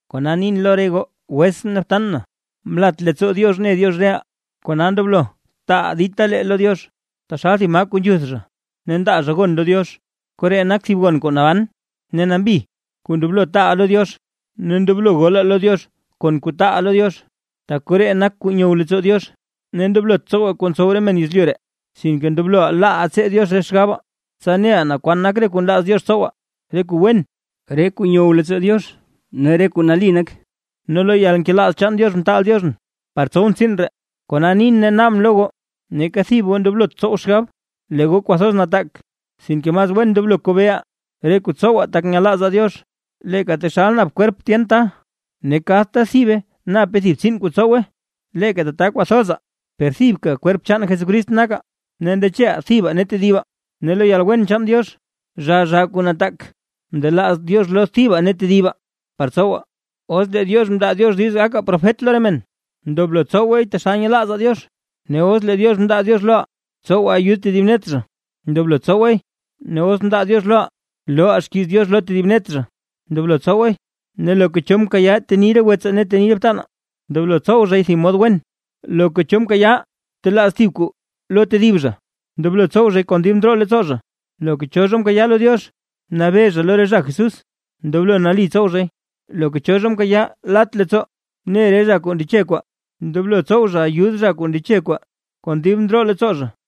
Kona nin lo re goo wetsʼn ne btan na, mlat leettsoo Diox mne Diox reʼaa, kona ndoblo taaʼaa dita lee lo Diox; taxal thib maa kuu nzhuth zha ne ndaa zha gon lo Diox. Koree nak thib gon kuu naban ne nambi kuu ndoblo taaʼaa lo Diox, ne ndoblo golaa lo Diox kon kuu taaʼaa lo Diox; tak koree nak kuu nyow leettsoo Diox. Ne ndoblot tsowaa re kuu ntsow re men yezlyu ree, sinke ndoblo laaʼaa tsee Diox re xgabaa, tsa neʼaa naa kwan re kuu nlaaz Diox tsowaa, re kuu wen, re kuu nyow leettsoo Diox ne re kuu nali nak. Ne lo yalnkelaaz chaan Diox mtaal Dioxʼn par tsow tsiin ree, kona nin ne naabʼn lo goo, neeka thib goo ndoblot tsow xgab, lee goo kwathoz nataak, sinke mas wen ndoblo kobeeʼaa re kuu tsowaa tak nyelaazaa Diox. Leeka taxal nap kwerp men tyen ta, ne kadta thibe nape thib tsiin kuu ntsowe, leeka tata kwathozaa, per thibka kwerp chaan Jesucrist nakaa, ne ndecheʼaa thibaa ne tedibaa. Ne lo yalwen chaan Diox, zhaa zhaa kuu nataak mndelaaz Diox lo thiba ne thibaa par tsowaa. Os lee Diox mndaa Diox diiz loʼaa gakaa profet re men, ndoblo tsowaay taxal nyelaazaa Diox. Ne os lee Diox mndaa Diox loʼaa tsowaa ayud tedib net zha, ndoblo wen tsowaay. Ne os mndaa Diox loʼaa looʼaa xkiiz Diox lo tedib net zha, ndoblo tsowaay. Loka cho zha mkayaa teni re wetsaa ne re btanaa, ndoblo tsow zhay thib mod wen, loka cho zha mkayaa talaaz thib kuu lo tedib zha, ndoblo tsow zhay kon dib ndroo leettsoo zha. Loka cho zha mkayaa lo Diox nabee zha lo re zha Jesús, ndoblo nali tsow zhay, loka cho zha mkayaa lat leettsoo ne re zha kuu ndeche kwaa, ndoblo tsow zha ayud zha kuu ndeche kwaa, kon dib ndroo leettsoo zha.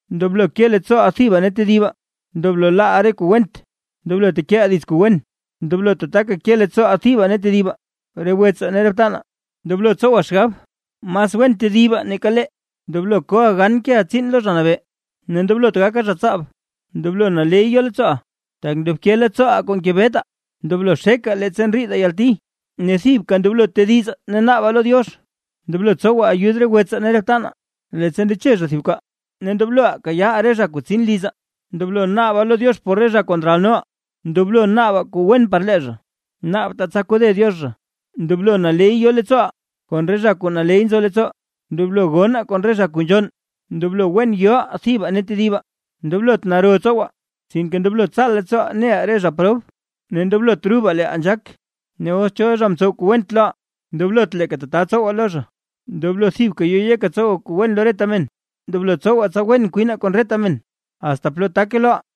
Ndoblo ke leettsooʼaa thibaa ne tedibaa. Ndoblo laaʼaa re kuu went, ndoblo tekeʼaa dits kuu wen. Ndoblo tataka ke leettsooʼaa thibaa ne tedibaa re wetsaa ne re btanaa, ne ndoblo tsowaa xgab mas wen tedibaa nake leeʼaa. Ndoblo koʼaa gan keʼaa tsiin lo Zha Nabee, ne ndoblot gakaa zha tsaab. Ndoblo naley yo leettsooʼaa, tak ndobke leettsooʼaa kuu ngebetaa; ndoblo xekaa leettsa ndriidaa yalti ne thibka ndoblo tedizaa ne naabaa lo Diox. Ndoblo tsowaa ayud re wetsaa ne re btanaa, leettsa ndeche zha thib kwaa. Ne ndobloʼaa kayaaʼaa re zha kuu tsin lizaa. Ndoblo naabaa lo Diox por re zha kuu ndralnoʼaa; ne ndoblo naabaa kuu wen par lee zha, naabtaa tsa kode Diox zha. Ndoblo naley yo leettsooʼaa kon re zha kuu naley nzo leettsoo, ndoblo gonnaa kon re zha kuu nzhonn. Ndoblo wen yoʼaa thibaa ne tedibaa. Ndoblot naro tsowaa, sinke ndoblo tsaal leettsooʼaa neʼaa re zha prob, ne ndoblot rubaa leeʼaa nzhaak. Os cho zha mtsow kuu went loʼaa, ndoblot leeka tata tsowaa lo zha. Ndoblo thibka yo yekaa tsowaa kuu wen lo reta men. Ndoblo tsowaa tsa wen kwinaa kon reta men, asta plo take loʼaa.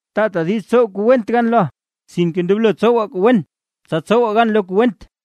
Taataa diiz tsow kuu went gan loʼaa, sinke ndoblo tsowaa kuu wen, tsa tsowaa gan lo kuu went.